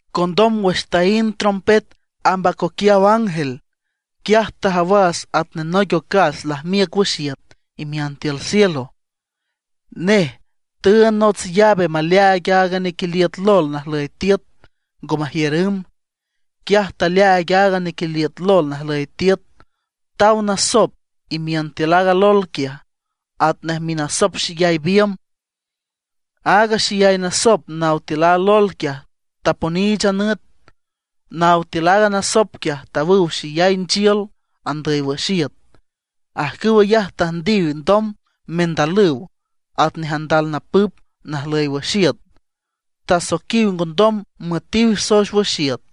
Condom wüx taínd trompet amb acoquiaw ángel, quiaj tajawas atnej noic ocas lajmiüc wüx iüt imiün tiül cielo. Nej tüünd nots llave maleaaig aaga nequiliüt lol najlüy tiüt, ngo majiür ümb. Quiaj taleaaig aaga nequiliüt lol najlüy tiüt; taw nasop imiün tiül aaga lol quiaj, atnej minasop xeyay biümb. Aaga xeyay nasop naw tiül a lol quiaj taponiich a nüt. Naw tiül aaga nasop quiaj tawüw xeyay nchiül andüy wüx iüt. Ajcüw ayaj tüjndiw ndom mendalüw atnej andal napüp najlüy wüx iüt. Tasoiquiw ngondom müetiw soex wüx iüt,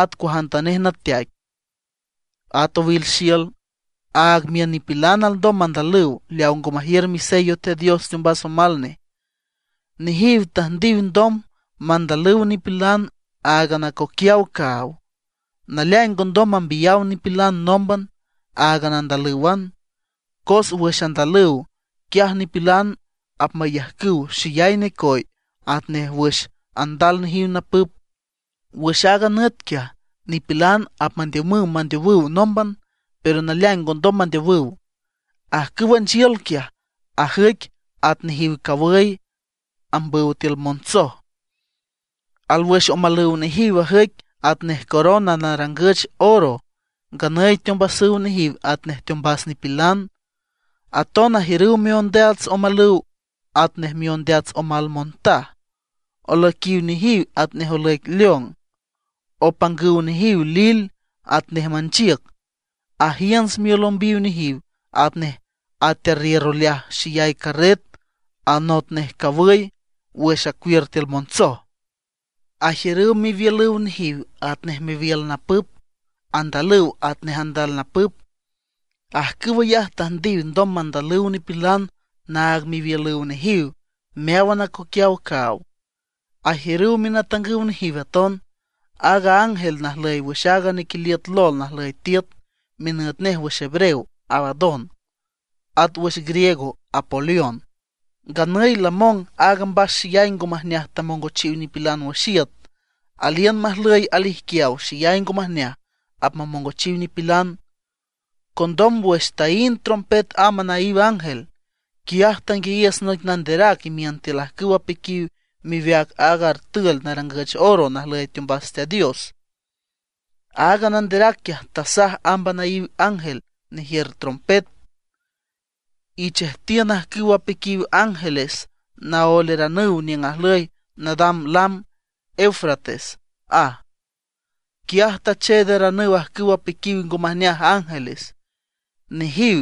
at cuajantanej nateaic, at owil xiül, aag miün nipilan alndom mandalüw leawa ngo majiür misello Teat Dios teombas omal nej. Nejiw tüjndiw ndom mandalüw nipilan áagan acoquiaw caaw. Naleaing ngondom mambiyaw nipilan nómban, áaga andalǘwan. Cos wüx andalüw, quiaj nipilan apmayajcüw xeyay necoy atnej wüx andal nejiw napüp. Wüx aaga nüt quiaj, nipilan apmandiümüw mandeowüw nómban, pero naleaing ngondom mandeowüw. Ajcüwa nchiül quiaj, ajüic at nejiw cawüy apmambüw tiül montsoj. Alwüx omalüw nejiw ajüic atnej corona narangüch oro; nganüy teombasüw nejiw atnej teombas nipilan. Aton ajiürüw miondeats omalüw atnej miondeats omal montaj; olüiquiw nejiw atnej olüic león. Opangüw nejiw lil atnej manchiüc; ajiünts miolümbiw nejiw atnej atearriür oleaj xeyay carret anot nej cawüy wüx acuiür tiül montsoj. Ajiürüw miwiülüw nejiw atnej miwiül napüp, andalüw atnej andal napüp. Ajcüw ayaj tüjndiw ndom mandalüw nipilan naag miwiülüw nejiw meáwan acoquiaw caaw. Ajiürüw minatangüw nejiw aton, aaga ángel najlüy wüx aaga nequiliüt lol najlüy tiüt. Minüt nej wüx hebreo Abadón, at wüx griego Apolión. Nganüy lamong aaga mbas xeyay ngo majneaj tamongochiw nipilan wüx iüt; aliün majlüy alijquiaw xeyay ngo majneaj apmamongochiw nipilan. Condom wüx taínd trompet amb anaíw ángel, quiaj tanguiayiüs noic nanderac imiün tiül ajcüw apiquiw miweac aaga artül narangüch oro najlüy teombas Teat Dios. Aaga nanderac quiaj tasaj amb anaíw ángel nejiür trompet: ―Ichejtiün ajcüw apiquiw ángeles naoelaranüw niüng ajlüy nadam lam Eufrates ―aj. Quiaj tacheedaranüw ajcüw apiquiw ngo majneaj ángeles. Nejiw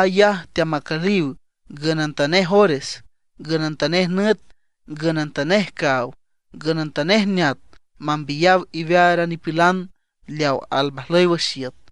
ayaj teamacüliw ngünantanej ores, ngünantanej nüt, ngünantanej caaw, ngünantanej neat mambiyaw iwear a nipilan leaw almajlüy wüx iüt.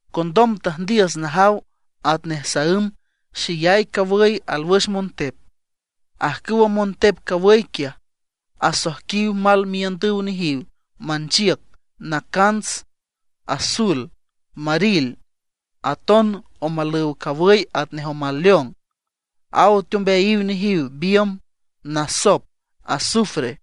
Condom tüjndiüs najaw atnej saǘm xeyay cawüy alwüx montep. Ajcüwa montep cawüy quiaj asoijquiw mal miiündüw nejiw manchiüc nacants, azul, maril. Aton omalüw cawüy atnej omal león; aw teombeayiw nejiw biümb, nasop, azufre.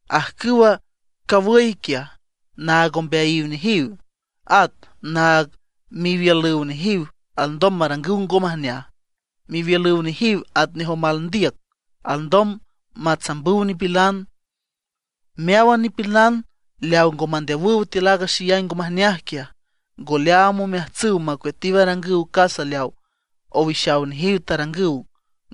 Ajcüwa cawüy quiaj naag ombeayiw nejiw, at naag miwiülüw nejiw alndom marangüw ngo majneaj. Miwiülüw nejiw atnej omal ndiüc, alndom matsambüw nipilan. Meáwan nipilan leaw ngo mandeowüw tiül aaga xeyay ngo majneaj quiaj, ngo leaam omeajtsüw macueatiw arangüw casa leaw owixaw nejiw tarangüw.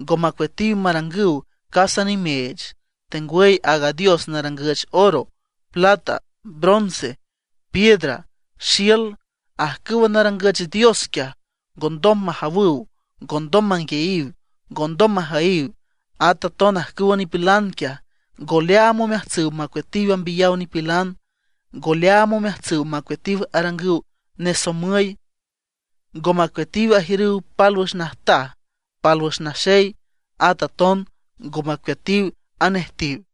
Ngo macueatiw marangüw casa nimeech, tengwüy aaga dios narangüch oro, plata, bronce, piedra, xiül. Ajcüwa narangüch dios quiaj, ngondom majawüw, ngondom manguiayiw, ngondom majüyiw. At aton ajcüwa nipilan quiaj, ngo leaam omeajtsüw macueatiw ambiyaw nipilan, ngo leaam omeajtsüw macueatiw arangüw nesomüy, ngo macueatiw ajiürüw pálwüx najtaj, pálwüx naxey; at aton ngo macueatiw anejtiw.